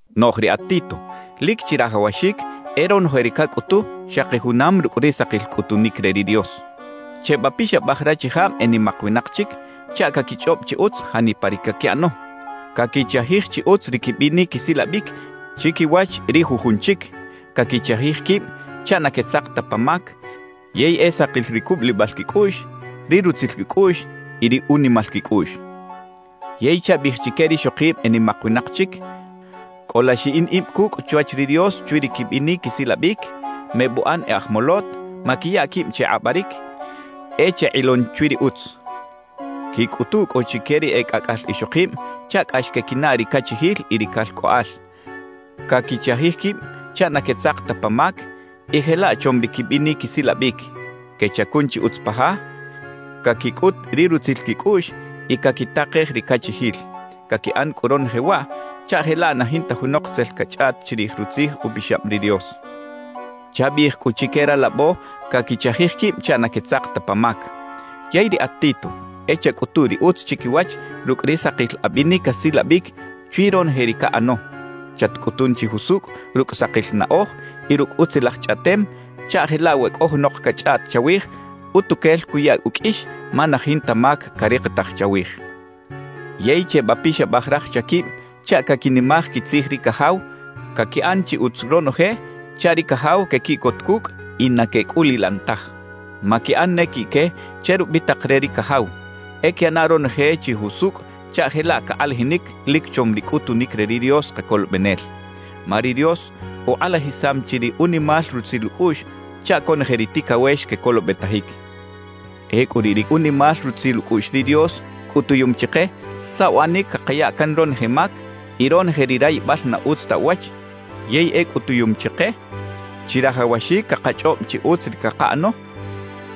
Noꞌj riꞌat Tito, lic chirajawaxic e ronoje ri cacꞌutu xaki junam rucꞌ ri sakil cꞌutunic re ri Dios. Chebapixabaj rachijab e nimak winak chic chaꞌ caquichꞌob chi utz janipa ri caquiꞌano, caquichajij chi utz ri quibinic quisilabic chiquiwach ri jujun chic, caquichajij quib chaꞌ na quetzak ta pa mac, yey e sakil ri cubulibal quicꞌuꞌx, ri rutzil quicꞌuꞌx y ri unimal quicꞌuꞌx. Yey chabiꞌij chique rixokib e nimak winak chic: Cꞌola xiꞌin ib cucꞌ chwach ri Dios chwi ri quibinic quisilabic, mebuꞌan e aj molot, maquiya quib che kꞌabaric, e chekꞌilon chwi ri utz. Quicꞌutu cꞌu chique ri e cꞌacꞌal ixokib chaꞌ cꞌax quequinaꞌ ri cachijil y ri calcꞌoꞌal, caquichajij quib chaꞌ na quetzak ta pa mac y jelaꞌ chom ri quibinic quisilabic, quechacun chi utz pa ja, caquicꞌut ri rutzil quicꞌuꞌx y caquitakej ri cachijil. Caquiꞌan cꞌu ronoje waꞌ chaꞌ jelaꞌ na jinta junok tzel cachꞌaꞌt chirij Rutzij Upixab ri Dios. Chabiꞌij cꞌu chique ralabo caquichajij quib chaꞌ na quetzak ta pa mac. Yey riꞌat Tito, e chacꞌutu ri utz chiquiwach rucꞌ ri sakil abinic asilabic chwi ronoje ri caꞌano. Chatcꞌutun chi jusucꞌ rucꞌ sakil naꞌoj y rucꞌ utzilaj chꞌaꞌtem chaꞌ jelaꞌ we cꞌo junok cachꞌaꞌt chawij, utuquel cuya uqꞌuix ma na jinta mac carikitaj chawij. Yey chebapixabaj raj chaquib chaꞌ caquinimaj quitzij ri cajaw, caquiꞌan chi utz ronoje chaꞌ ri cajaw quequiꞌcot cucꞌ y na quecꞌulilaꞌn taj. Maquiꞌan ne quiꞌque che rubitak re ri cajaw; e quiꞌana ronoje chi jusucꞌ chaꞌ jelaꞌ cakꞌalajinic lic chom ri cꞌutunic re ri Dios Kacolobenel. Ma ri Dios ukꞌalajisam chi ri unimal rutzil ucꞌuꞌx chaꞌ conoje ri ticawex quecolobetajic. Ecꞌu riꞌ ri unimal rutzil ucꞌuꞌx ri Dios cꞌutuyum chike saꞌ uꞌanic cakaya can ronoje mac y ronoje ri rayibal na utz ta uwach, yey e cꞌutuyum chike chirajawaxic cakachꞌob chi utz ri cakaꞌano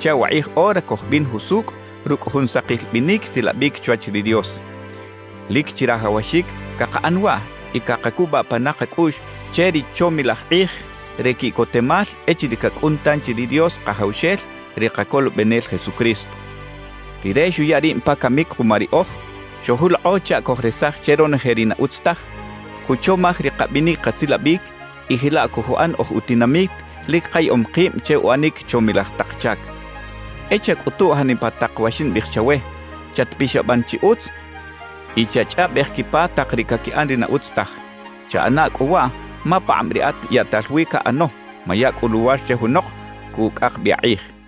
chaꞌ wakꞌij ora cojbin jusucꞌ rucꞌ jun sakil binic silabic chwach ri Dios. Lic chirajawaxic cakaꞌan waꞌ y cakacubaꞌ pana kacꞌuꞌx che ri chomilaj kꞌij re quiꞌcotemal echiriꞌ cacꞌun tanchi ri Dios Kajawxel, ri Kacolobenel Jesucristo. Rire xuya rib pa camic kuma riꞌoj, xojulokꞌo chaꞌ cojresaj che ronoje ri na utz taj, cuchomaj ri kabinic kasilabic y jelaꞌ cojuꞌan oj utinamit lic kayaꞌom kib che uꞌanic chomilaj tak chac. E chacꞌutuꞌ janipa tak wa ximbiꞌij chawe; chatpixaban chi utz y chachꞌaꞌbej quipa tak ri caquiꞌan ri na utz taj. Chaꞌana cꞌu waꞌ ma pakꞌab riꞌat yaꞌtal wi caꞌano; maya cꞌu luwar che junok cucꞌak bi akꞌij.